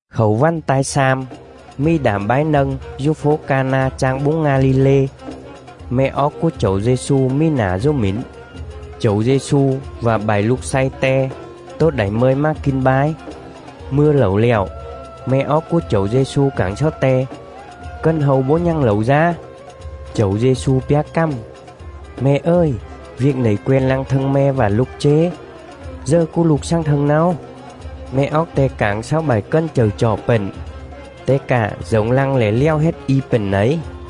Khảu vằn ta̱i slam, mì đảm bái nâng dú fố Ca-na chang búng Nga-li-lê; me̱ oóc cúa Chẩu Dê-xu mì nả dú mỉn. Chẩu Dê-xu vạ bại lục slay Te tố đảy mơi mà kin bái. Mư̱a lẩu lẹo, me̱ oóc cúa Chẩu Dê-xu cảng xáu Te: “Cần hâu bấu nhằng lẩu dá.” Chẩu Dê-xu pjá cằm: “Me̱ ời, viêc nẩy quen lăng thâng me̱ vạ lục chế? Dờ cúa lục xằng thâng náo.” Me̱ oóc Te cảng xáu bại cần chậư chọ pện: “Te cạ dổng lăng lẻ lèo hết i pện nẩy.”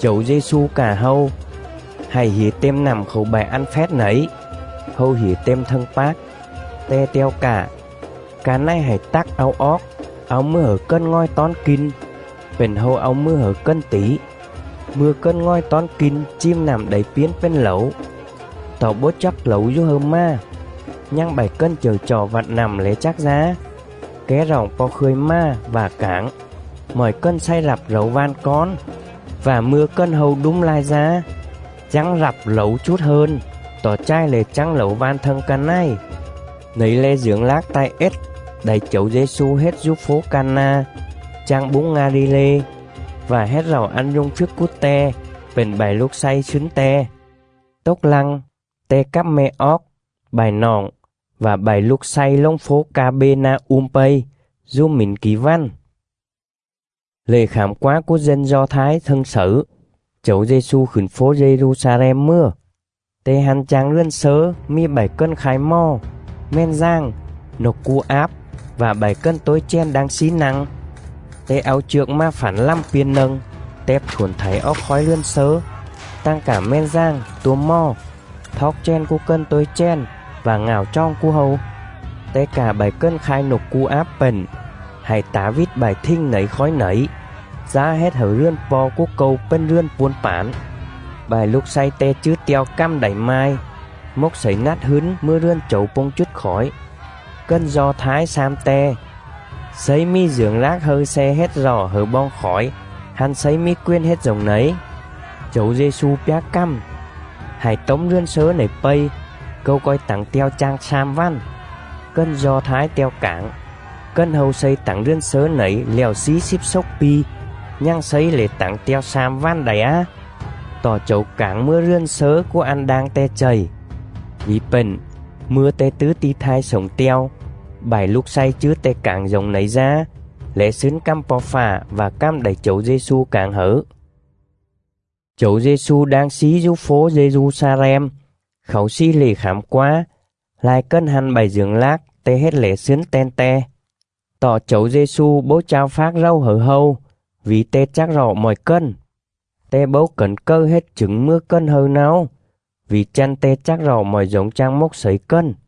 Chẩu Dê-xu cạ hâu: “Hạy hỉa têm nặm khảu bại ăn phét nẩy.” Hâu hỉa têm thâng pác. Te te̱o cạ: “Ca này hạy tắc au oóc, au mừa hẩư cần ngòi tón kin.” Pện hâu au mừa hẩư cần tỉ. Mư̱a cần ngòi tón kin chìm nặm đảy piến pền lẩu (tọ bấu chắc lẩu dú hâư mà, nhằng bại cần chậư chọ vặt nặm lẻ chắc dá), ké roọng po̱ khươi mà vạ cảng: “Mọi cần xày rặp lẩu van cón, vạ mư̱a cần hâu đúm lai dá, chắng rặp lẩu chút hơn, tọ chài lẻ chắng lẩu van thâng ca này.” Nẩy le̱ dưởng lác ta̱i ết đảy Chẩu Dê-xu hết dú fố Ca-na, chang búng Nga-li-lê, vạ hết rọ ăn rung phjức cúa Te pện bại lục slay slứn Te. Tốc lăng, Te cắp me̱ oóc, bại noọng, vạ bại lục slay lồng fố Ca-bê-na-um pây, dú mỉn kỉ vằn.. Lệ Khảm Quá cúa dân Do Thái thâng xẩư, Chẩu Dê-xu khửn fố Dê-ru-xa-lem mừa.. Te hăn chang rườn slớ mì bại cần khai mò, mèn dàng, nộc cu áp, vạ bại cần tối chèn đang slí nă̱ng. Te au chược mà phẳn lằm piên nâng, tẹp thuổn thảy oóc khói rườn slớ, tằng cạ mèn dàng, tua mò; thoóc chèn cúa cần tối chèn vạ ngạo choòng cúa hâu. Te cạ bại cần khai nộc cu áp pện: “Hạy tả vít bại thình nẩy khói nẩy, dá hết hẩư rườn Po̱ cúa Câu pền rườn puôn pản.” Bại lục slay Te chứ te̱o cằm đảy mai: “Mốc slẩy nắt hứn mừa rườn Chẩu pông chút khỏi.”. Cần Do Thái xam Te: “Slấy mì dưởng lác hâư sle hết rọ hẩư boong khỏi hăn Slấy mì quền hết dổng nẩy?” Chẩu Dê-xu pjá cằm: “Hạy tốm rườn slớ nẩy pây, Câu co̱i tẳng te̱o chang slam vằn.”. Cần Do Thái te̱o cảng: “Cần hâu xây tẳng rườn slớ nẩy lẹo slí slíp xốc pi, nhằng Slấy lẻ tẳng te̱o slam vằn đảy á?” Tọ Chẩu cảng mừa rườn slớ cúa ăn đang Te chầy. Vỉ pện, mư̱a Te tứ ti̱ thai slổng te̱o, bại lục slay chứ Te cảng dổng nẩy dá, lẻ slứn Cằm Po̱ Fạ vạ cằm đảy Chẩu Dê-xu cảng hẩư. Chẩu Dê-xu đang slí dú fố Dê-ru-xa-lem khảu slì lệ Khảm Quá, lai cần hăn bại dưởng lác Te hết lẻ slứn ten Te. Tọ Chẩu Dê-xu bấu chao phác rầu hẩư hâu, vỉ Te chắc rọ mọi cần. Te bấu cẩn cầư hết chửng mừa cần hâư náo, vỉ chăn Te chắc rọ mọi dổng chang mốc slẩy cần.